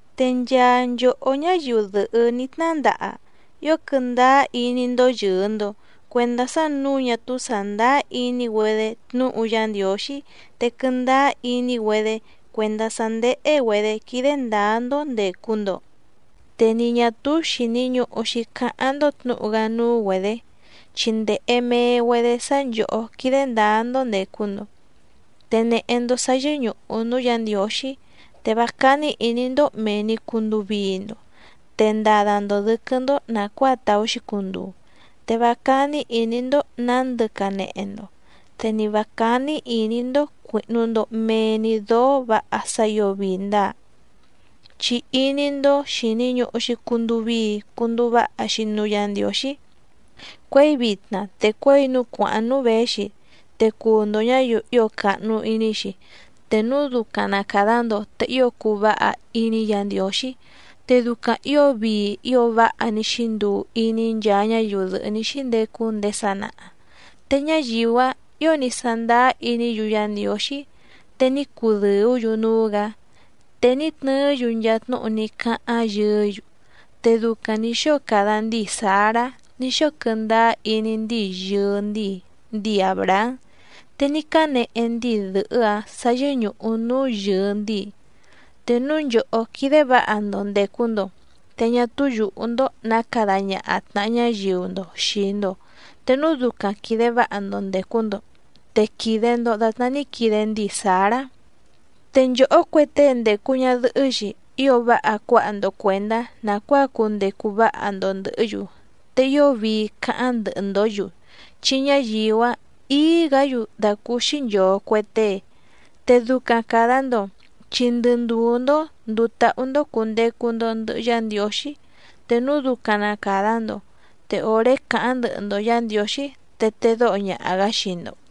Te nchaa nchòhó ñáyiu dɨ̀hɨ́ ní tnandaha ío quɨndáá iní‑ndó yɨ̀ɨ‑ndo cuendá sá nǔu ñá túú sàndáá iní‑güedé tnúhu Yá Ndiǒxí te quɨndáá iní‑güedé cuèndá sá ndéhé‑güedě quídé ndǎá‑ndó ndècu‑ndo, te ni ñà túú xìni ñuhu‑xi cáháⁿ‑ndó tnǔhu‑gá núú‑güedě. Chi ndèhe mee‑güedé sá nchòhó quídé ndǎá‑ndó ndècu‑ndo, te nèhe‑ndo sá yɨ́ñùhu núú Yǎ Ndiǒxí. Te vá cání ìní‑ndó mèe‑ni cunduu vii‑ndo, te ndada‑ndo dɨ̌quɨ́‑ndó nàcuáa tàú‑xi cunduu, te vá cání ìní‑ndó nǎndɨ canehe‑ndo, te ni vǎ cání ìní‑ndó cuìhnu‑ndo mee‑ni dóó vǎha sá ǐo vii ndáa. Chi iní‑ndó xìni ñuhu‑xi cunduu vii cunduu váha‑xi núú Yǎ Ndiǒxí cuěi vitna te cuěi núú cuǎháⁿ núú věxi, te cuu‑ndo ñǎyiu ío càhnu iní‑xi, te núu ducaⁿ na càda‑ndo te ío cuu váha iní Yǎ Ndiǒxí. Te ducaⁿ ǐo vii ío váha ní xínduu iní nchaa ñáyiu dɨ̀hɨ́ ní xíndecu ndéé sanaha, te ñáyiu‑áⁿ ǐo ní sándáá iní‑yu Yá Ndiǒxí te ní cudɨ̀ú‑yu núú‑gǎ, te ní tnɨɨ́‑yu nchaa tnúhu ní cáháⁿ yɨɨ́‑yu. Te ducaⁿ nǐ xóo cada ndíi Sǎrá ní xóo quɨndáá iní ndíi yɨɨ ndíi, ndíi Àbrahám, te ní cánehe ndíi dɨ̀hɨ́‑áⁿ sǎ yɨ́ñùhu núú yɨɨ ndíi. Te núu nchòhó quídé vǎha‑ndo ndècu‑ndo te ñá túú yùhú‑ndó nǎ cada ñaha tnàha ñáyiu‑ndo xìi‑ndo, te núu ducaⁿ quìde váha‑ndo ndècu‑ndo te quìde‑ndo datná ní quide ndíi Sǎrá. Te nchòhó cue tée ndècu ñadɨhɨ́‑xi ío váha cuáha‑ndo cuèndá nàcuáa cundecu váha‑ndo ndɨ̀hɨ́‑yu, te ío vii cáháⁿ ndɨhɨ‑ndǒ‑yu, chi ñáyiu‑áⁿ ǐí‑gǎ‑yu dàcúúxí nchòo cue tée, te ducaⁿ càda‑ndo chi ndɨ ndùú‑ndó ndùu táhú‑ndó cùndecu‑ndo ndɨhɨ Yá Ndiǒxí, te núu ducaⁿ na càda‑ndo te òré cáháⁿ ndɨhɨ‑ndo Yǎ Ndiǒxí te tedóho ñaha‑gǎ xii‑ndo.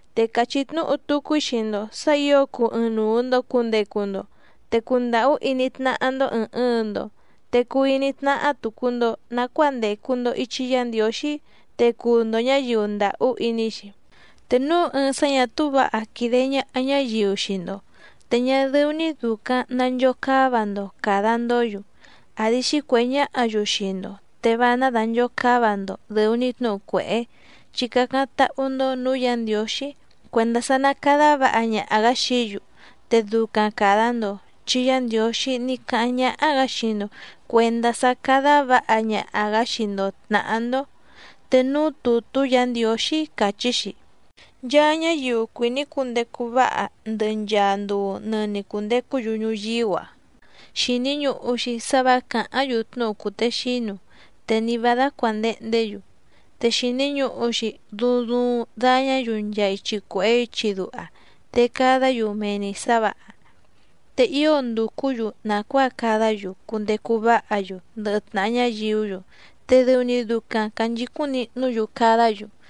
Te càchí tnúhu tucu‑í xii‑ndo sǎ ǐo cuu ɨɨⁿnuu‑ndo cùndecu‑ndo, te cundàhú iní tnáhá‑ndó ɨ̀ɨⁿ ɨɨⁿ‑ndo, te cuu iní tnáhá tùcu‑ndo nacuáa ndècu‑ndo ichi Yá Ndiǒxí, te cuu‑ndo ñǎyiu ndàhú iní‑xi. Te núu ɨɨⁿ sá ñà túú vǎha quìde ñaha ñáyiu xii‑ndo, te ñá dɨ́ú‑ní dùcaⁿ nanchocáva‑ndo càda‑ndó‑yu, àdi xícuèhé ñáhǎ‑yu xii‑ndo, te vá ná dànchocáva‑ndo dɨ̀u‑ni tnúhu cuèhé, chi cácáⁿ táhú‑ndó nǔú Yǎ Ndiǒxí cuèndá sá ná cádá vǎha ñaha‑gǎ xií‑yu, te ducaⁿ càda‑ndo chi Yá Ndiǒxí ní cáháⁿ ñáhá‑gǎ xii‑ndo cuèndá sá cádá vǎha ñaha‑gǎ xii‑ndo tnàhá‑ndó. Te núú tùtú Yǎ Ndiǒxí càchí‑xi: Nchaa ñáyiu cuìní cundecu váha ndɨ nchàa nduu nɨni cundecú‑yu ñuyíú‑a, xìni ñuhu‑xi sá vǎ càháⁿ‑yu tnúhu cùtexínu, te ni vǎ dácuàndehndé‑yu. Te xìni ñuhu‑xi duuⁿ duuⁿ dañá‑yu nchaa ichi cuèhé ichi duha, te cadá‑yu mee‑ni sǎ vǎha, te ío ndùcú‑yu nàcuáa cadá‑yu cundecu váha‑yu ndɨhɨ tnàha ñáyiú‑yu te dɨu‑ni ducaⁿ cànchicúⁿ nihnú‑yu cadá‑yu.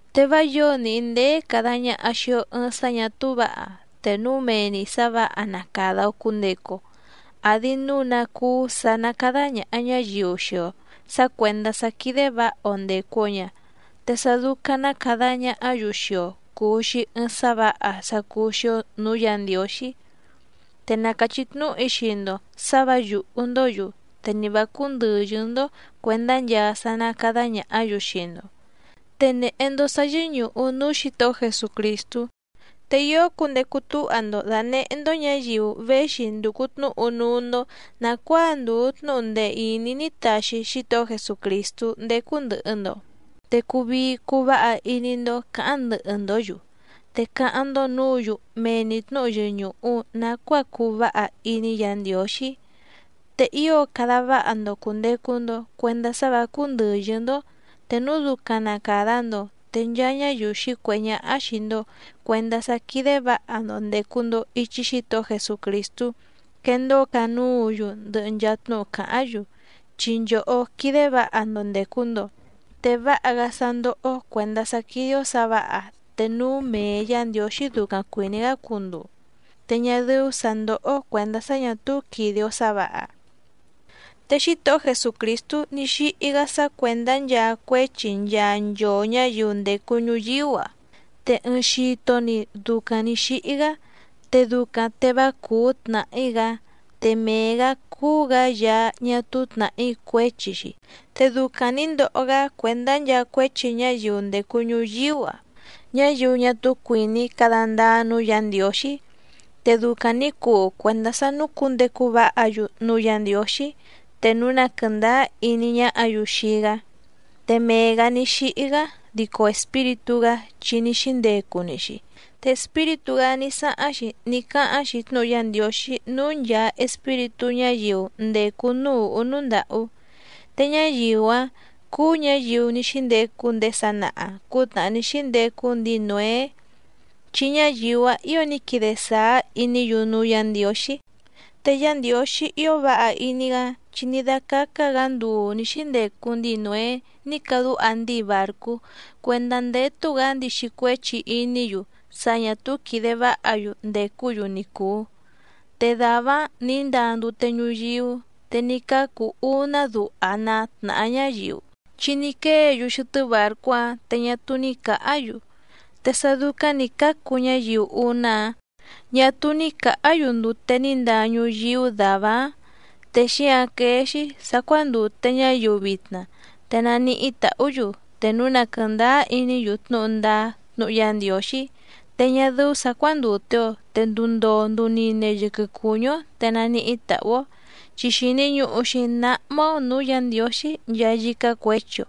Te vá yǒo níhí ndéé càda ñaha xii‑o ɨɨⁿ sá ñà túú vǎha te núu mee‑ni sǎ vǎha na càda‑o cundecu‑o. Àdi núu ná cúú sǎ ná cádá ñàha ñáyiu xii‑o sǎ cuèndá sá quídé vǎha‑o ndècu‑o ña, te sá dúcáⁿ ná cádá ñàhá‑yu xii‑o cùu‑xi ɨɨⁿ sá vǎha sá cúú‑xí‑ó nǔú Yǎ Ndiǒxí. Te na càchí tnúhu‑í xii‑ndo sǎ vǎ yùhú‑ndǒ‑yu, te ni vǎ cúndɨ̀yɨ́‑ndó cuèndá nchaa sá ná càda ñahá‑yu xii‑ndo. Te nèhe‑ndo sá yɨ́ñùhu núú Xǐtohó Jesucrìstú. Te ío cundecu túha‑ndo dànehé‑ndó ñǎyiu véxi ndùcu tnúhu núú‑ndó nàcuáa ndùu tnúhu ndee ìní ní taxi Xítohó Jesucrìstú ndécú ndɨ̀hɨ‑ndo, te cuu vii cuu váha iní‑ndó cǎháⁿ ndɨhɨ‑ndǒ‑yu, te cáháⁿ‑ndó nǔǔ‑yu mee‑ni tnǔhu yɨñùhu nacuáa cùu váha iní Yǎ Ndiǒxí. Te ío cada váha‑ndo cùndecu‑ndo cuendá sá vǎ cúndɨ̀yɨ́‑ndó, te núu ducaⁿ na càda‑ndo, te nchaa ñáyiu xǐcuèhé ñáhá xìi‑ndo cuendá sá quídé vǎha‑ndo ndècu‑ndo ichi Xítohó Jesucrìstú quendóo canúǔ‑yu ndɨhɨ nchaa tnúhu càháⁿ‑yu, chi nchòhó quídé vǎha‑ndo ndècu‑ndo. Te váha‑gá sá ndóhó‑ó cuèndá sá quídé‑ó sǎ vǎha te núu mee Yǎ Ndiǒxí ducaⁿ cuìní‑gá cunduu, te ñá dɨ́ú sǎ ndóhó‑ó cuèndá sá ñà túú quìde‑o sá vǎha. Te Xítohó Jesucrìstú ní xíhí‑gá sá cuèndá nchaa cuéchi nchaa nchoo ñǎyiu ndècu ñuyíú‑a, te ɨɨⁿ xito‑ni ducaⁿ nǐ xíhí‑gá te ducaⁿ te vá cùú tnàhí‑gá, te mee‑gǎ cúú‑gǎ Yaá ñá túú tnàhí cuéchi‑xi, te ducaⁿ nǐ ndoho‑gá cuèndá nchaa cuéchi ñáyiu ndècu ñuyíú‑a ñáyiu ñá túú cuìní cada ndáá núú Yǎ Ndiǒxí, te ducaⁿ nǐ cuu cuèndá sá núcǔndecu váha‑yu núú Yǎ Ndiǒxí te núu na quɨ̀ndáá iní ñáhǎ‑yu xii‑gá. Te mee‑gǎ ní xíhí‑gá dico Espíritú‑gá chi ní xíndecu‑ni‑xi, te Espíritú‑gá ní sáháⁿ‑xi ní cáháⁿ‑xi tnúhu Yá Ndiǒxí núú nchàa espíritú ñáyiu ndècu núú ùhú núú ndàhú. Te ñáyiu‑áⁿ cúú ñǎyiu ní xíndecu ndéé sanaha cǔtnàhá ní xíndecu ndíi Nǒé, chi ñáyiu‑áⁿ ǐo ní quide sàá iní‑yu núú Yǎ Ndiǒxí. Te Yá Ndiǒxí ío váha iní‑gá, chi ní dácácá‑gǎ nduu nǐ xíndecuu ndíi Nǒé ní cadúha ndíi bàrcú cuèndá ndétú‑gǎ ndixi cuéchi iní‑yu sá ñà túú quìde váha‑yu ndècú‑yu ni cùu. Te dàvá‑áⁿ nǐ ndaa ndute ñuyíú te ní cácu úná duha ná tnàhá ñáyiu, chi ní quée‑yu xɨtɨ́ bàrcú‑áⁿ, te ñá túú ní cǎhá‑yu. Te sá dúcáⁿ nǐ cácu ñáyiu úná‑áⁿ ñà túú ní cǎhá‑yu ndute ní ndaa ñuyíú dàvá‑áⁿ. Te xíǎⁿ quéé‑xí sǎ cuándùte ñáyiu vitna, te naníhí tàhú‑yu te núu na quɨ̀ndáá iní‑yu tnúhu ndáá tnúhu Yá Ndiǒxí. Te ñá dɨ́ú sǎ cuándùte‑o te nduu ndoo nduu nine yɨquɨ cùñú‑ó te naníhí tàhú‑ó, chi xìni ñuhu‑xi náhmá‑ó nǔú Yǎ Ndiǒxí nchaa yícá cuěchi‑o,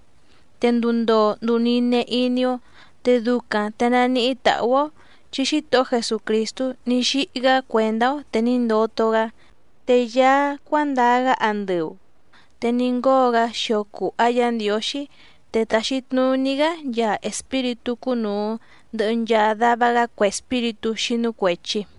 te nduu ndoo nduu nine iní‑ó, te ducaⁿ te naníhí tàhú‑ó, chi Xítohó Jesucrìstú ní xíhí‑gá cuèndá‑ó te ní ndoto‑gá. Te Yaá‑áⁿ cuǎndaa‑gá andɨu, te ní ngóo‑gá xio cùha Yá Ndiǒxí, te tàxi tnuní‑gá nchaa espíritú cúnùu ndɨhɨ nchaa dava‑gá cue espíritú xínú cuèchi.